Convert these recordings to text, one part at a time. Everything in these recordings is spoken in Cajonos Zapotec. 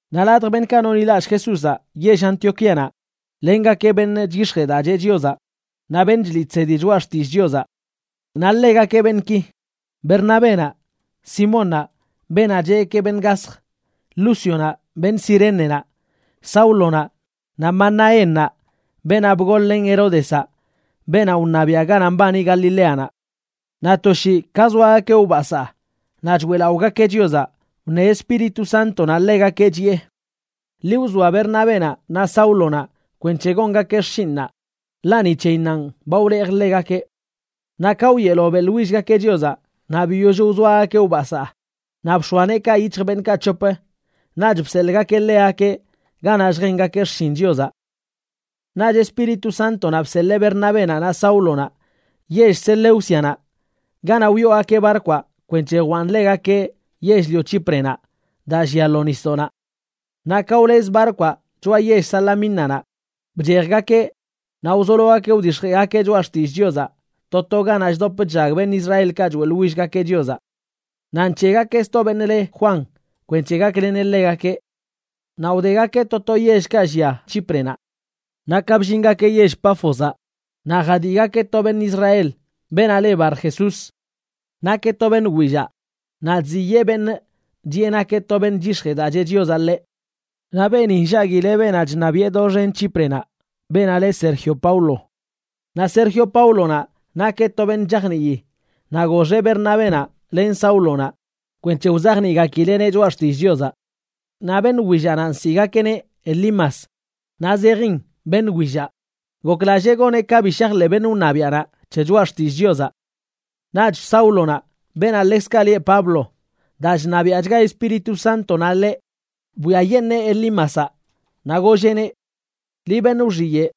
Naꞌ ladj beṉꞌkaꞌ nonḻilallꞌ Jesúzaꞌ yell Antioquíanaꞌ lengakeꞌ beṉꞌ chyix̱jee daa cheꞌ Chiozaꞌ naꞌ beṉꞌ chliꞌ chsedi choꞌa xtillꞌ Chiozaꞌ. Naꞌ ḻegakeꞌ beṉꞌki: Bernabénaꞌ, Simónnaꞌ, beenaꞌ cheꞌgakeꞌ beṉꞌ gasj, Lúcionaꞌ beṉꞌ Cirénenaꞌ, Sáulonaꞌ naꞌ Manaénnaꞌ, beenaꞌ bgol-len Heródezaꞌ beenaꞌ wṉabiaꞌ ganaꞌ mbani Galileanaꞌ. Naꞌ to shii ka zoagakeꞌ wbasaa naꞌ choeꞌlaꞌogakeꞌ Chiozaꞌ wṉe Espíritu Sántonaꞌ ḻegakeꞌ, chiꞌe: ―Ḻi wzoa Bernabénaꞌ naꞌ Sáulonaꞌ kwenc̱he gongakeꞌ xshinꞌnaꞌ, ḻaꞌ ni c̱heyinnanꞌ ba wlejꞌ ḻegakeꞌ. Naꞌ ka wyeelo beꞌḻwillgakeꞌ Chiozaꞌ naꞌ biyoll wzoagakeꞌ wbasaa, naꞌ bx̱oa neekaꞌ yic̱hj beṉꞌkaꞌ c̱hop, naꞌch bseḻꞌgakeꞌ ḻegakeꞌ ganaꞌ lljengakeꞌ xshin Chiozaꞌ. Naꞌch Espíritu Sántonaꞌ bseḻee Bernabénaꞌ naꞌ Sáulonaꞌ yell Seleúcianaꞌ ganaꞌ wyoogakeꞌ barkwaꞌ kwenc̱he jwaan ḻegakeꞌ yell-lio Chíprenaꞌ daa llia lo nisdoꞌnaꞌ. Naꞌ ka wlez barkwaꞌ choꞌa yell Salamínanaꞌ, bchejgakeꞌ naꞌ wzologakeꞌ wdix̱jeꞌgakeꞌ choꞌa xtillꞌ Chiozaꞌ to to ganaꞌ chdop chllag beṉꞌ Israelkaꞌ choeꞌḻwillgakeꞌ Chiozaꞌ. Naꞌ nc̱heꞌgakeꞌ sto beṉꞌ le Juan kwenc̱he gakleneꞌ ḻegakeꞌ. Naꞌ wdegakeꞌ to to yellkaꞌ llia Chíprenaꞌ. Naꞌ ka bllingakeꞌ yell Páfozaꞌ, naꞌ jadiꞌgakeꞌ to beṉꞌ Israel, beenaꞌ le Barjesús. Nakeꞌ to beṉꞌ willaꞌ, naꞌ chziyee beṉꞌ chiꞌe nakeꞌ to beṉꞌ chyix̱jee daa cheꞌ Chiozaꞌ ḻeꞌ. Naꞌ beeni nllaguileꞌ beenaꞌ chṉabiꞌe doxen Chíprenaꞌ, beenaꞌ leꞌ Sergio Paulo. Naꞌ Sergio Paulonaꞌ nakeꞌ to beṉꞌ chajnii, naꞌ goxeꞌ Bernabénaꞌ len Sáulonaꞌ kwenc̱he wzajniꞌgakileꞌneꞌ choꞌa xtillꞌ Chiozaꞌ. Naꞌ beṉꞌ willaꞌnaꞌ, nsiꞌgakeꞌneꞌ Elimas (naꞌ zejin beṉꞌ willaꞌ), goklallee goneꞌ ka bi shajḻeꞌ beṉꞌ wṉabiaꞌnaꞌ c̱he choꞌa xtillꞌ Chiozaꞌ. Naꞌch Sáulonaꞌ, beenaꞌ ḻekzkaꞌ lieꞌ Pablo, daa chṉabiaꞌchga Espíritu Sántonaꞌ ḻeꞌ, bwiayeṉee Elímazaꞌ, naꞌ golleꞌneꞌ: ―¡Liꞌ benꞌ wxiyeꞌ,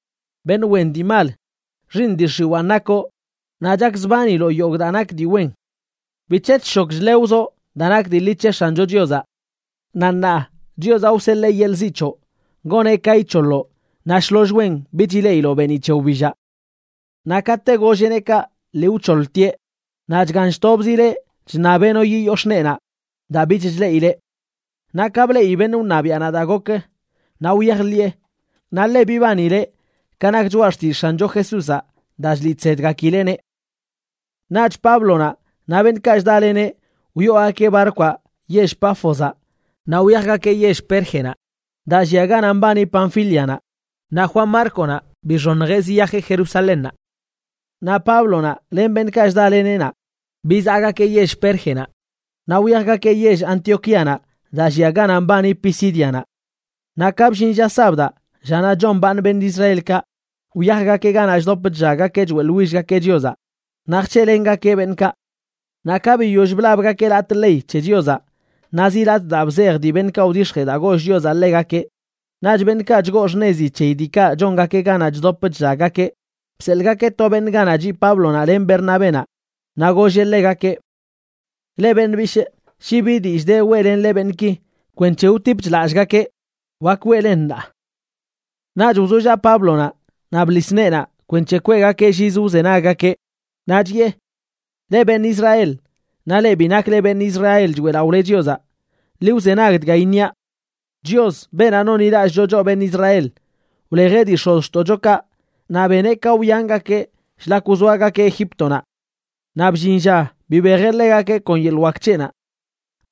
beṉꞌ wen dii mal, xiiṉ dii x̱iwaan nakoꞌ naꞌ chakzbaniloꞌ yogꞌ daa nak dii wen! ¿Bic̱he chshok chlewzoꞌ daa nak dii ḻi c̱he X̱ancho Chiozaꞌ? Naꞌ ṉaa Chiozaꞌ wseḻee yeḻꞌ ziꞌ c̱hoꞌ, goneꞌ ka ic̱hoḻoꞌ naꞌ shloll wen bich ileꞌiloꞌ beeniꞌ c̱he wbillaꞌ. Naꞌ kate golleꞌneꞌ kaꞌ lii wc̱hoḻtieꞌ, naꞌ chgan chtobzileꞌ chṉabeꞌ no yiyox̱ꞌ neenaꞌ daa bich chleꞌileꞌ. Naꞌ ka bleꞌi beṉꞌ wṉabiaꞌnaꞌ daa gok, naꞌ wyajḻiꞌe, naꞌ le bibanileꞌ ka nak choꞌa xtillꞌ X̱ancho Jesúzaꞌ daa chliꞌ chsedgakileꞌneꞌ. Naꞌch Páblonaꞌ naꞌ beṉꞌkaꞌ chdaleneꞌ wyoogakeꞌ barkwaꞌ yell Páfozaꞌ naꞌ wyajgakeꞌ yell Pérgenaꞌ daa llia ganaꞌ mbani Panfílianaꞌ, naꞌ Juan Márconaꞌ bixoṉjeꞌ ziyajeꞌ Jerusalénnaꞌ. Naꞌ Páblonaꞌ len beṉꞌkaꞌ chdaleneꞌ naꞌ, bizaꞌgakeꞌ yell Pérgenaꞌ naꞌ wyajgakeꞌ yell Antioquíanaꞌ daa llia ganaꞌ mbani Pisídianaꞌ. Naꞌ ka bllin lla sabdaꞌ, llanaꞌ chombaaṉ beṉꞌ Israelkaꞌ, wyajgakeꞌ ganaꞌ chdop chllaggakeꞌ choeꞌḻwillgakeꞌ Chiozaꞌ, naꞌ jc̱heꞌlengakeꞌ beṉꞌkaꞌ. Naꞌ ka biyoll blabgakeꞌ latꞌ ley c̱he Chiozaꞌ naꞌ zi latꞌ daa bzej dii beṉꞌkaꞌ wdix̱jee daa goll Chiozaꞌ ḻegakeꞌ, naꞌch beṉꞌkaꞌ chgoo xṉezi c̱heyi diikaꞌ chongakeꞌ ganaꞌ chdop chllaggakeꞌ bseḻꞌgakeꞌ to beṉꞌ ganaꞌ chiꞌ Páblonaꞌ len Bernabénaꞌ naꞌ golleꞌ ḻegakeꞌ: ―Leꞌ beṉꞌ bishꞌ, shi bi dillꞌ de weꞌlenle beṉꞌki kwenc̱he wtipch lallꞌgakeꞌ, wak weꞌlen ṉaa. Naꞌch wzollaꞌ Páblonaꞌ naꞌ bḻis neenaꞌ kwenc̱he kweꞌgakeꞌ llizə wzenaggakeꞌ, naꞌ chiꞌe: ―Leꞌ, beṉꞌ Israel, naꞌ leꞌ bi nakle beṉꞌ Israel choeꞌlaꞌole Chiozaꞌ, ḻi wzenag dga iṉiaꞌ: Chios, beenaꞌ nonḻilallꞌcho choꞌ beṉꞌ Israel, wlejeꞌ dii x̱ozxtoꞌchokaꞌ naꞌ beneꞌ ka wyangakeꞌ shlak wzoagakeꞌ Egíptonaꞌ. Naꞌ bllin lla bibejeꞌ ḻegakeꞌ kon yeḻꞌ wak c̱heꞌnaꞌ.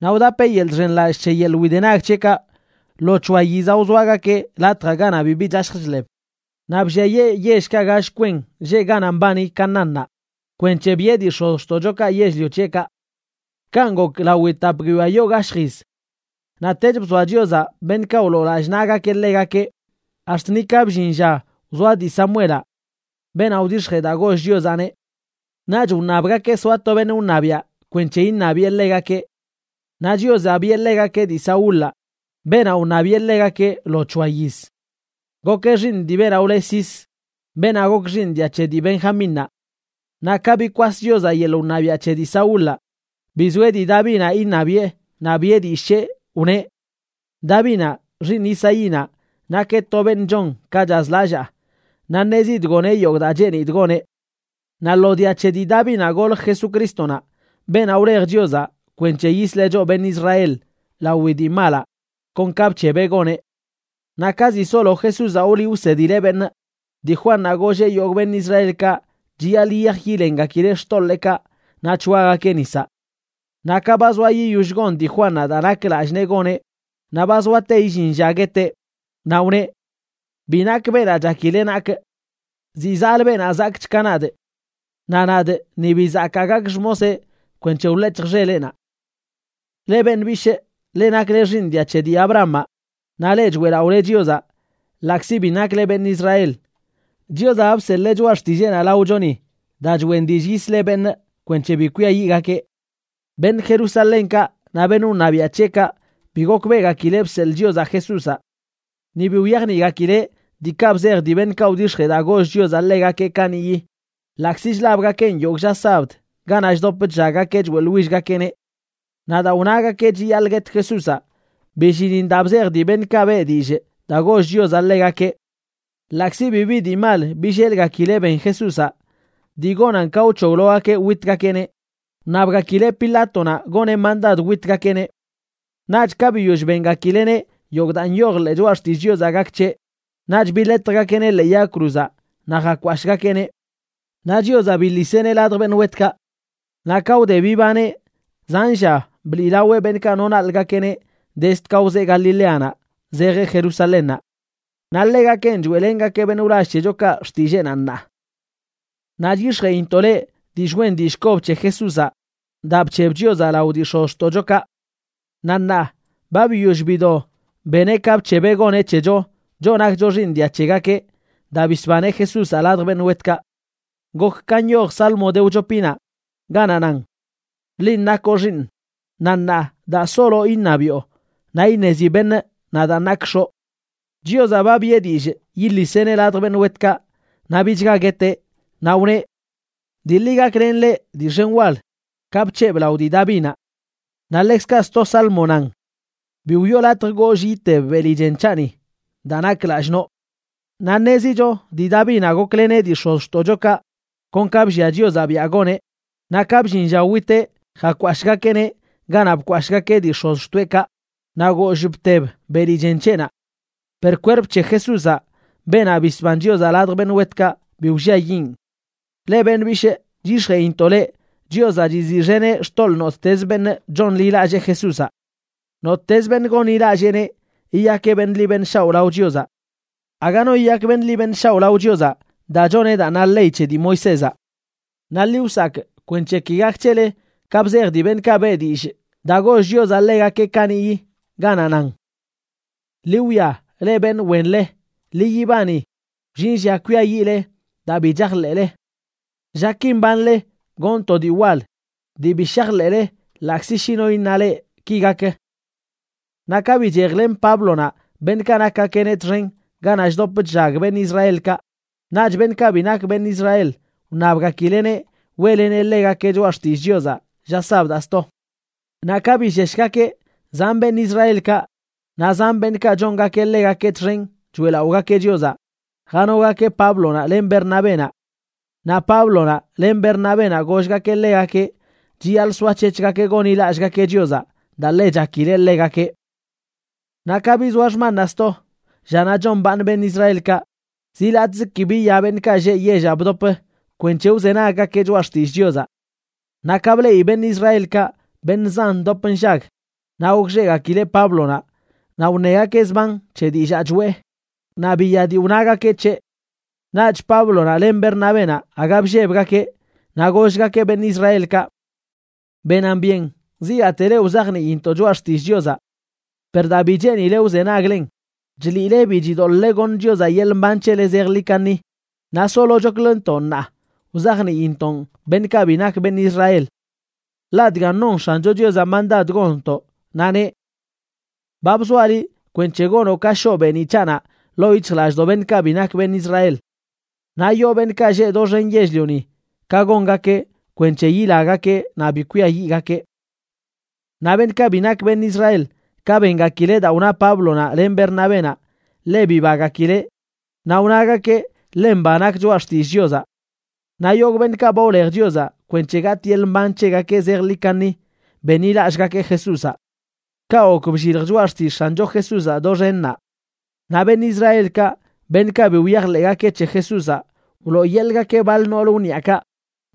Naꞌ wdapeꞌ yeḻꞌ chxenlallꞌ c̱he yeḻꞌ widenag c̱heꞌkaꞌ lo c̱hoa yizaꞌ wzoagakeꞌ latjaꞌ ganaꞌ bibi chashj chḻeb. Naꞌ blliayee yellkaꞌ gall kwen lleꞌ ganaꞌ mbani Canaánnaꞌ kwenc̱he biꞌe dii x̱ozxtoꞌchokaꞌ yell-lio c̱heꞌkaꞌ. Kanꞌ gok lawi tap guiyoa yoo gashj yiz. Naꞌtech, bzoaꞌ Chiozaꞌ beṉꞌkaꞌ wloo lallꞌ naꞌgakeꞌ ḻegakeꞌ, ax̱t nika bllin lla wzoa dii Samuelaꞌ, beenaꞌ wdix̱jee daa goll Chiozaꞌneꞌ. Naꞌch wṉabgakeꞌ soa to beṉꞌ wṉabiaꞌ kwenc̱he iṉabiꞌe ḻegakeꞌ. Naꞌ Chiozaꞌ biꞌe ḻegakeꞌ dii Saúlaꞌ, beenaꞌ wṉabiꞌe ḻegakeꞌ lo c̱hoa yiz. Gokeꞌ xiiṉ dii beenaꞌ wle Cis, beenaꞌ gok xiiṉ dia c̱he dii Benjamínnaꞌ. Naꞌ ka bikwas Chiozaꞌ yeḻꞌ wṉabiaꞌ c̱he dii Saúlaꞌ, bizoeꞌ dii Davinaꞌ iṉabiꞌe naꞌ biꞌe dillꞌ c̱heꞌ, wneꞌ: “Davinaꞌ, xiiṉ Isaínaꞌ, nakeꞌ to beṉꞌ chon ka chazlallaa, naꞌ ṉezidꞌ goneꞌ yogꞌ daa cheenidꞌ goneꞌ.” Naꞌ lo dia c̱he dii Davinaꞌ golj Jesucrístonaꞌ, beenaꞌ wlej Chiozaꞌ kwenc̱he yisleꞌ choꞌ beṉꞌ Israel lawi dii malaꞌ kon kaꞌ bc̱hebeꞌ goneꞌ. Naꞌ ka ziꞌ solo Jesúzaꞌ wliꞌ wsedileꞌ beṉꞌ, dii Juannaꞌ golleꞌ yogꞌ beṉꞌ Israelkaꞌ chiyaḻꞌ yiyaj yilengakileꞌ xtoḻeekaꞌ naꞌ c̱hoagakeꞌ nisaꞌ. Naꞌ ka ba zoa yiyoll gon dii Juannaꞌ daa nak lallꞌ nee goneꞌ, naꞌ ba zoate illin lla gueteꞌ, naꞌ wneꞌ: “Bi nakꞌ beenaꞌ chakile nakꞌ. Ziꞌ zaꞌlə beenaꞌ zakꞌch ka nadꞌ. Naꞌ nadꞌ ni bi zakaa gakꞌ xmoseꞌ kwenc̱he wḻec̱hjꞌ xeleꞌnaꞌ.” ’Leꞌ beṉꞌ bishꞌ, leꞌ nakle xiiṉ dia c̱he dii Abrahamaꞌ, naꞌ leꞌ choeꞌlaꞌole Chiozaꞌ ḻaꞌkzi bi nakle beṉꞌ Israel, Chiozaꞌ ba bseḻee choꞌa xtilleenaꞌ laochoni daa choꞌen dillꞌ yisleꞌ beṉꞌ kwenc̱he bi kwiayiꞌgakeꞌ. Beṉꞌ Jerusalénkaꞌ naꞌ beṉꞌ wṉabiaꞌ c̱heꞌkaꞌ bi gokbeꞌgakileꞌ bseḻꞌ Chiozaꞌ Jesúzaꞌ. Ni bi wyajniꞌgakileꞌ diikaꞌ bzej dii beṉꞌkaꞌ wdix̱jee daa goll Chiozaꞌ ḻegakeꞌ kaniꞌyi, ḻaꞌkzi chlabgakeꞌn yogꞌ lla sabd ganaꞌ chdop chllaggakeꞌ choeꞌḻwillgakeꞌneꞌ. Naꞌ daa wnagakeꞌ chiyaḻꞌ guet Jesúzaꞌ, billinin daa bzej dii beṉꞌkaꞌ beꞌ dillꞌ daa goll Chiozaꞌ ḻegakeꞌ. Ḻaꞌkzi bibi dii mal billelgakileꞌ ben Jesúzaꞌ dii gonan ka wc̱hoglogakeꞌ witgakeꞌneꞌ, wṉabgakileꞌ Pilátonaꞌ goneꞌ mandad witgakeꞌneꞌ. Naꞌch ka biyoll bengakileꞌneꞌ yogꞌ daa nyoj ḻee choꞌa xtillꞌ Chiozaꞌ gak c̱heꞌ, naꞌch biḻetjgakeꞌneꞌ ḻee yag cruzaꞌ naꞌ jakwashꞌgakeꞌneꞌ. Naꞌ Chiozaꞌ biḻiseꞌneꞌ ladj beṉꞌ wetkaꞌ. Naꞌ ka wde bibaneꞌ, zan lla bliꞌlaweꞌ beṉꞌkaꞌ wno wnaḻꞌgakeꞌneꞌ dezd ka wzee Galileanaꞌ zejeꞌ Jerusalénnaꞌ. Naꞌ ḻegakenꞌ choeꞌlengakee beṉꞌ wlall c̱hechokaꞌ xtilleenaꞌ ṉaa. ’Naꞌ chyix̱jeꞌintoꞌ leꞌ dillꞌ wen dillꞌ kob c̱he Jesúzaꞌ daa bc̱heb Chiozaꞌ lao dii x̱ozxtoꞌchokaꞌ. Naꞌ ṉaa ba biyoll bido beneꞌ ka bc̱hebeꞌ goneꞌ c̱hecho, choꞌ nakcho xiiṉ dia c̱hegakeꞌ, daa bisbaneꞌ Jesúzaꞌ ladj beṉꞌ wetkaꞌ. Gok ka nyoj Salmo de wchopinaꞌ, ganaꞌ nan: “Linꞌ nakoꞌ Xiiṉꞌ, naꞌ ṉaa, daa solo iṉabiꞌo naꞌ iṉezi beṉꞌ nadaan nakꞌ X̱oꞌ.” Chiozaꞌ ba biꞌe dillꞌ yiḻiseꞌneꞌ ladj beṉꞌ wetkaꞌ naꞌ bichga gueteꞌ, naꞌ wneꞌ: “Dii ḻi gaklenꞌ leꞌ dii xen wal ka bc̱hebꞌ lao dii Davinaꞌ.” Naꞌ ḻekzkaꞌ sto Salmo nan: “Bi wiꞌo latj goollꞌ iteb beli chen c̱haꞌni, daa nakꞌ lallꞌ noꞌ.” Naꞌ ṉezicho dii Davinaꞌ gokleneꞌ dii x̱ozxtoꞌchokaꞌ kon ka bllia Chiozaꞌ biꞌa goneꞌ, naꞌ ka bllin lla witeꞌ jakwashꞌgakeꞌneꞌ ganaꞌ bkwashꞌgakeꞌ dii x̱ozxtoeꞌkaꞌ, naꞌ goollꞌ bteb beli chen c̱heꞌnaꞌ. Per kwerp c̱he Jesúzaꞌ, beenaꞌ bisban Chiozaꞌ ladj beṉꞌ wetkaꞌ, bi wlliayiꞌn. Leꞌ beṉꞌ bishꞌ, chyix̱jeꞌintoꞌ leꞌ Chiozaꞌ chiziꞌxeneꞌ xtoḻꞌ nottez beṉꞌ chonḻilallee Jesúzaꞌ. Nottez beṉꞌ gonḻilalleeneꞌ yiyakeꞌ beṉꞌ ḻi beṉꞌ shaoꞌ lao Chiozaꞌ. Aga no yiyak beṉꞌ ḻi beṉꞌ shaoꞌ lao Chiozaꞌ daa choneꞌ daa na ley c̱he dii Moisézaꞌ. Naꞌ ḻi wsakꞌ kwenc̱he ki gak c̱hele ka bzej dii beṉꞌkaꞌ beꞌ dillꞌ daa goll Chiozaꞌ ḻegakeꞌ kaniꞌyi, ganaꞌ nan: Ḻi wwia, leꞌ beṉꞌ wenḻe. Ḻi yibani. Wllin lla kwiayiꞌle daa bi chajḻeꞌle. Llaki mbanle gonꞌ to dii wal dii bi shajḻeꞌle ḻaꞌkzi shi no iṉa leꞌ ki gak. Naꞌ ka bichejlen Páblonaꞌ beṉꞌkaꞌ nakgakeꞌneꞌ txen ganaꞌ chdop chllag beṉꞌ Israelkaꞌ, naꞌch beṉꞌkaꞌ bi nak beṉꞌ Israel wṉabgakileꞌneꞌ weꞌleneꞌ ḻegakeꞌ choꞌa xtillꞌ Chiozaꞌ lla sabdaꞌ sto. Naꞌ ka billeshgakeꞌ, zan beṉꞌ Israelkaꞌ, naꞌ zan beṉꞌkaꞌ chongakeꞌ ḻegakeꞌ txen choeꞌlaꞌogakeꞌ Chiozaꞌ, janogakeꞌ Páblonaꞌ len Bernabénaꞌ. Naꞌ Páblonaꞌ len Bernabénaꞌ gollgakeꞌ ḻegakeꞌ chiyaḻꞌ soac̱hec̱hgakeꞌ gonḻilallꞌgakeꞌ Chiozaꞌ daa ḻe chakileꞌ ḻegakeꞌ. Naꞌ ka bizoa xmannaꞌ sto, llanaꞌ chombaaṉ beṉꞌ Israelkaꞌ, zi latꞌz ki biya beṉꞌkaꞌ lleꞌ yellaꞌ bdop kwenc̱he wzenaggakeꞌ choꞌa xtillꞌ Chiozaꞌ. Naꞌ ka bleꞌi beṉꞌ Israelkaꞌ beṉꞌ zan ndop nllag, naꞌ gokxeꞌgakileꞌ Páblonaꞌ naꞌ wṉegakeꞌ zban c̱he dillaa choꞌe, naꞌ biya dii wnagakeꞌ c̱heꞌ. Naꞌch Páblonaꞌ len Bernabénaꞌ aga bllebgakeꞌ, naꞌ gollgakeꞌ beṉꞌ Israelkaꞌ: ―Benan byen zigaate leꞌ wzajniintoꞌ choꞌa xtillꞌ Chiozaꞌ. Per daa bi cheenile wzenaglen, chliꞌle bi chidoḻꞌle goṉ Chiozaꞌ yeḻꞌ mban c̱hele zejḻi kaṉi, naꞌ solochokləntoꞌ ṉaa wzajniintoꞌn beṉꞌkaꞌ bi nak beṉꞌ Israel. Ḻaꞌ dgan non X̱ancho Chiozaꞌ mandad gonntoꞌ, naꞌ neꞌ: Ba bzoaꞌ liꞌ kwenc̱he gonoꞌ ka shoꞌ beeniꞌ c̱haꞌnaꞌ ḻoo yic̱hjlallꞌdoꞌ beṉꞌkaꞌ bi nak beṉꞌ Israel. Naꞌ yoo beṉꞌkaꞌ lleꞌ doxen yell-lioni ka gongakeꞌ kwenc̱he yilagakeꞌ naꞌ bi kwiayiꞌgakeꞌ. Naꞌ beṉꞌkaꞌ bi nak beṉꞌ Israel, ka bengakileꞌ daa wna Páblonaꞌ len Bernabénaꞌ, ḻe bibagakileꞌ naꞌ wnagakeꞌ ḻe mba nak choꞌa xtillꞌ Chiozaꞌ. Naꞌ yogꞌ beṉꞌkaꞌ ba wlej Chiozaꞌ kwenc̱he gatꞌ yeḻꞌ mban c̱hegakeꞌ zejḻi kaṉi benḻilallꞌgakeꞌ Jesúzaꞌ. Kaꞌ gok bllilj choꞌa xtillꞌ X̱ancho Jesúzaꞌ doxen naꞌ. Naꞌ beṉꞌ Israelkaꞌ, beṉꞌkaꞌ bi wyajḻeꞌgakeꞌ c̱he Jesúzaꞌ, wlooyeḻꞌgakeꞌ baḻ noolə wniaꞌkaꞌ,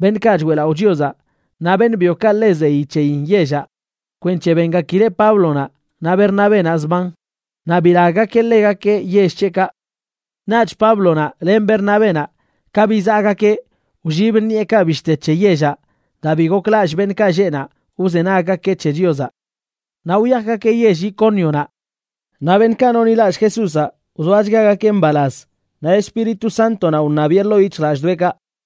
beṉꞌkaꞌ choeꞌlaꞌo Chiozaꞌ, naꞌ beṉꞌ byokaꞌ ḻe zeyi c̱heyin yellaꞌ kwenc̱he bengakileꞌ Páblonaꞌ naꞌ Bernabénaꞌ zban, naꞌ bilaggakeꞌ ḻegakeꞌ yell c̱heꞌkaꞌ. Naꞌch Páblonaꞌ len Bernabénaꞌ ka bizaꞌgakeꞌ wllib ṉiꞌekaꞌ bishte c̱he yellaꞌ daa bi goklallꞌ beṉꞌkaꞌ lleꞌ naꞌ wzenaggakeꞌ c̱he Chiozaꞌ. Naꞌ wyajgakeꞌ yell Icónionaꞌ. Naꞌ beṉꞌkaꞌ nonḻilallꞌ Jesúzaꞌ wzoachgagakeꞌ mbalaz, naꞌ Espíritu Sántonaꞌ wṉabiꞌe ḻoo yic̱hjlallꞌdoꞌekaꞌ.